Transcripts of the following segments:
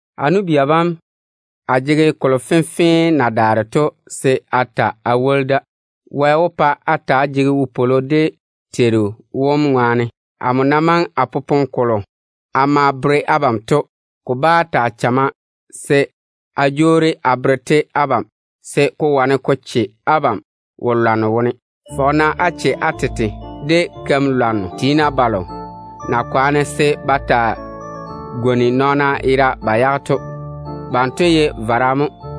A nu-bia bam, a jege kolo fenfee na daare to se a ta a woli da. Wɛ wó pa á ta‑á jege wopwolo dé Teiru wom ŋwaane. Amo na maŋe a popone kolo a ma bere abam to, ko bá taa chamma se a jwoori a bere-te abam, se ko wane ko che abam wo-lwanno wone. Fɔge-na á che á tete de wo-lwan-keira balo na kwaane se ba taa gwoni nɔɔna yera ba yage to. Banto ye vara mo.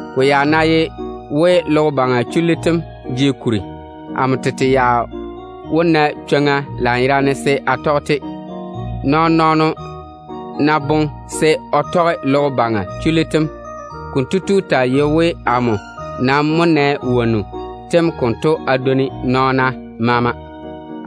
Ko ya ná ye we logo baŋa chullu tem jege kuri, amo tete ya wó na chwoŋa lanyerane se a ke a teena te wone. Nɔɔno wolo ná boŋe se o tɔge logo baŋa chullu tem, kotu taa yei we, amo mo dwoni nɔɔna maama chullu tem tɔgem seeni.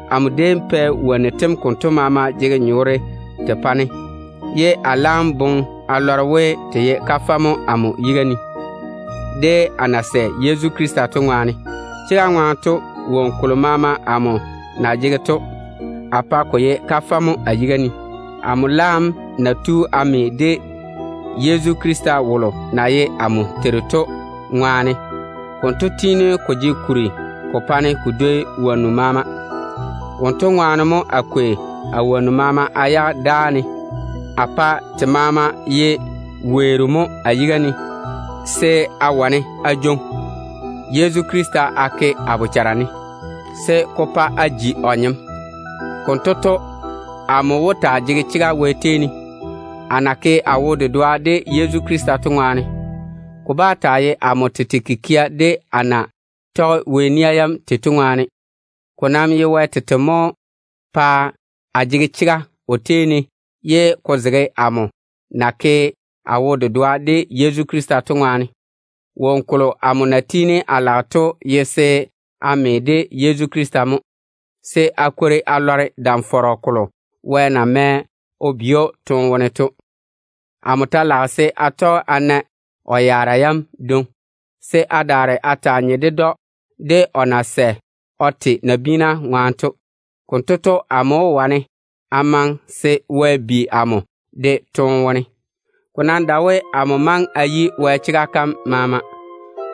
Amo déem pɛ wonnu tem konto maama jege nyɔɔre te pa-ne, ye a laam boŋe a lɔre we, te ye kafɛ mo amo yiga ne, a na sɛ Yezu Krista to ŋwaane. Chega ŋwaane to, woŋo kolo maama amo na jege to, a pa ko ye kafɛ mo a yiga ne, amo laam na tu a me de Yezu Krista wolo na ye amo Teiru to ŋwaane. Konto tiini ko jege kuri ko pa-ne ko dwoi woŋo maama. Wonto ŋwaane mo a kwei a woŋo maama a yage dáa ne. A pa te maama ye weero mo a yiga ne, se a wane a jwoŋi Yezu Krista a ke a bochare ne, se ko pa a ji o nyem. Konto to, amo wó taa jege chega Wɛ tei ne, a na ke a wo-dedoa de Yezu Krista to ŋwaane. Ko bá taa ye amo tete kikia de a na tɔge Wɛ nia yam tei to ŋwaane. Ko nam ye Wɛ tete mo pae a jege chega o tei ne, ye ko zege amo na ke a wo-dedoa de Yezu to ŋwaane. Woŋo kolo amo na tiini a lage to ye se a me de Yezu Krista mo, se a kwori a lɔre dam-fɔrɔ kolo Wɛ na mɛ o bi‑o toone wone to. Amo ta lage se a tɔge a na o yaara yam dwoŋi, se a daare a taa nye ded‑o de o na sɛ o te nabiina ŋwaane to. Konto to, amo wó wane a maŋe se Wɛ bi amo de toone wone. Ko nam dae we amo maŋe a yi Wɛ chega kam maama.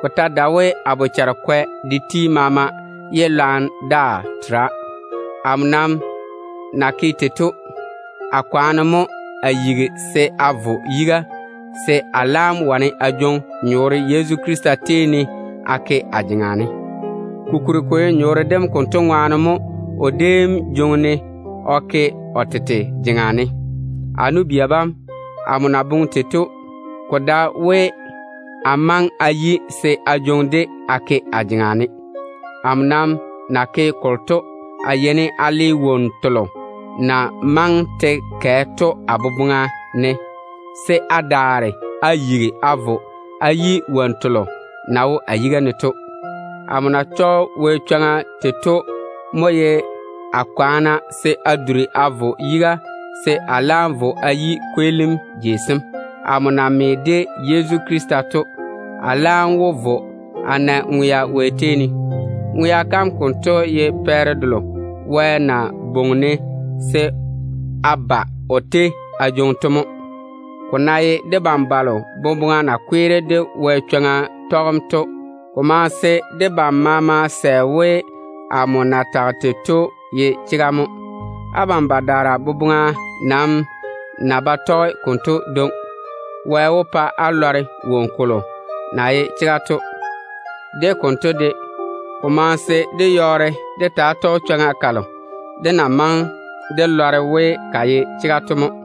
Ko ta dae we a bochare kwɛ de ti maama, ye lwarem daa tera. Amo nam na ke tei to, a kwaane mo a yigi se a vo yiga, se a laam wane a jwoŋi nyɔɔre Yezu Krista tei ne a ke a jeŋa ne. Kokuri ko ye nyɔɔre dem konto ŋwaane mo o déem jwoŋi-ne o ke o tete jeŋa ne. A nu-bia bam, amo na boŋe tei to, ko dae we a maŋe a yi se a jwoŋi-de a ke a jeŋa ne. Amo nam na ke kolo to, a yeini a le wonnu telo na maŋe te kɛ to a boboŋa ne, se a daare a yigi a vo a yi wonnu telo na wo a yiga ne to. Amo na tɔge Wɛ chwoŋa tei to, a yɔɔre a kwaana se a duri a vo yiga mo se a laam vo a yi kweelim jeiga kam. Amo na me de Yezu Krista to, a laam wó vo a na ŋwea Wɛ tei ne. Ŋwea kam kanto ye pɛɛre delo Wɛ na bwoŋi-ne se a ba o tei a jwoŋi to mo. Ko ná ye debam balo boboŋa na kweere de Wɛ chwoŋa tɔgem to, ko maŋe se debam maama sɛ we, amo na tage tei to ye chega mo. Abam badaara boboŋa nam ná ba tɔge konto dwoŋi, Wɛ wó pa á lɔre woŋo kolo na ye chega to. De konto de, ko maŋe se dé yɔɔre dé taa tɔge chwoŋa kalo dé na maŋe dé lɔre we ka ye chega to mo.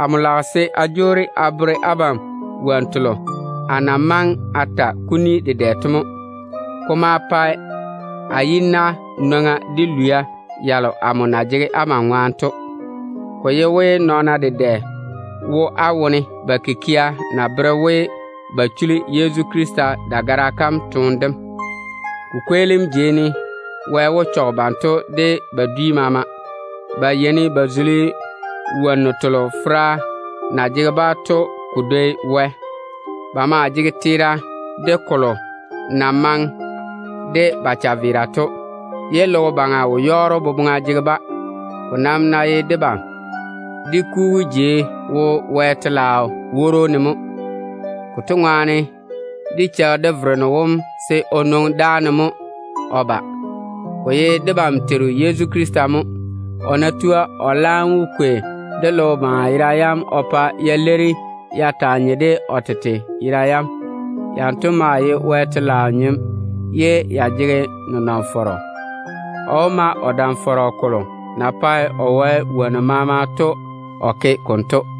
Amo lage se a jwoori a bere abam wonnu telo a na maŋe a ta kuni dedɛ to mo. Ko maa pae a kane yi-na de lwia yalo amo na jege abam ŋwaane to. Ko ye we nɔɔna dedɛ wo á wone ba kikia na bere we ba chuli Yezu Krista dagara kam toone dem. Ko kweelim jei ne Wɛ wó chɔge banto de ba dwi maama. Ba yeini ba zuli wonnu telo fera na jege-ba to ko dwoi Wɛ. Ba maa jege teera de kolo na maŋe de ba chaveera to, ye logo baŋa wo-yɔɔro boboŋa jege-ba. Ko nam ná ye debam, dé kugu jei wo Wɛ telaao woro kom ne mo. Konto ŋwaane, dé cheigi dé Vereno wom se o nwoŋi dáane mo o ba. Debam Teiru Yezu Krista mo konto. O ná tua, o laam wó kwei dé logo baŋa yera yam o pa ya leiri ya taa nye de o tete yera yam na tiini ya jege nenɔŋ-fɔrɔ to. O wó ma o dam-fɔrɔ kolo na pae o wae woŋo maama o taa tei to o ke konto.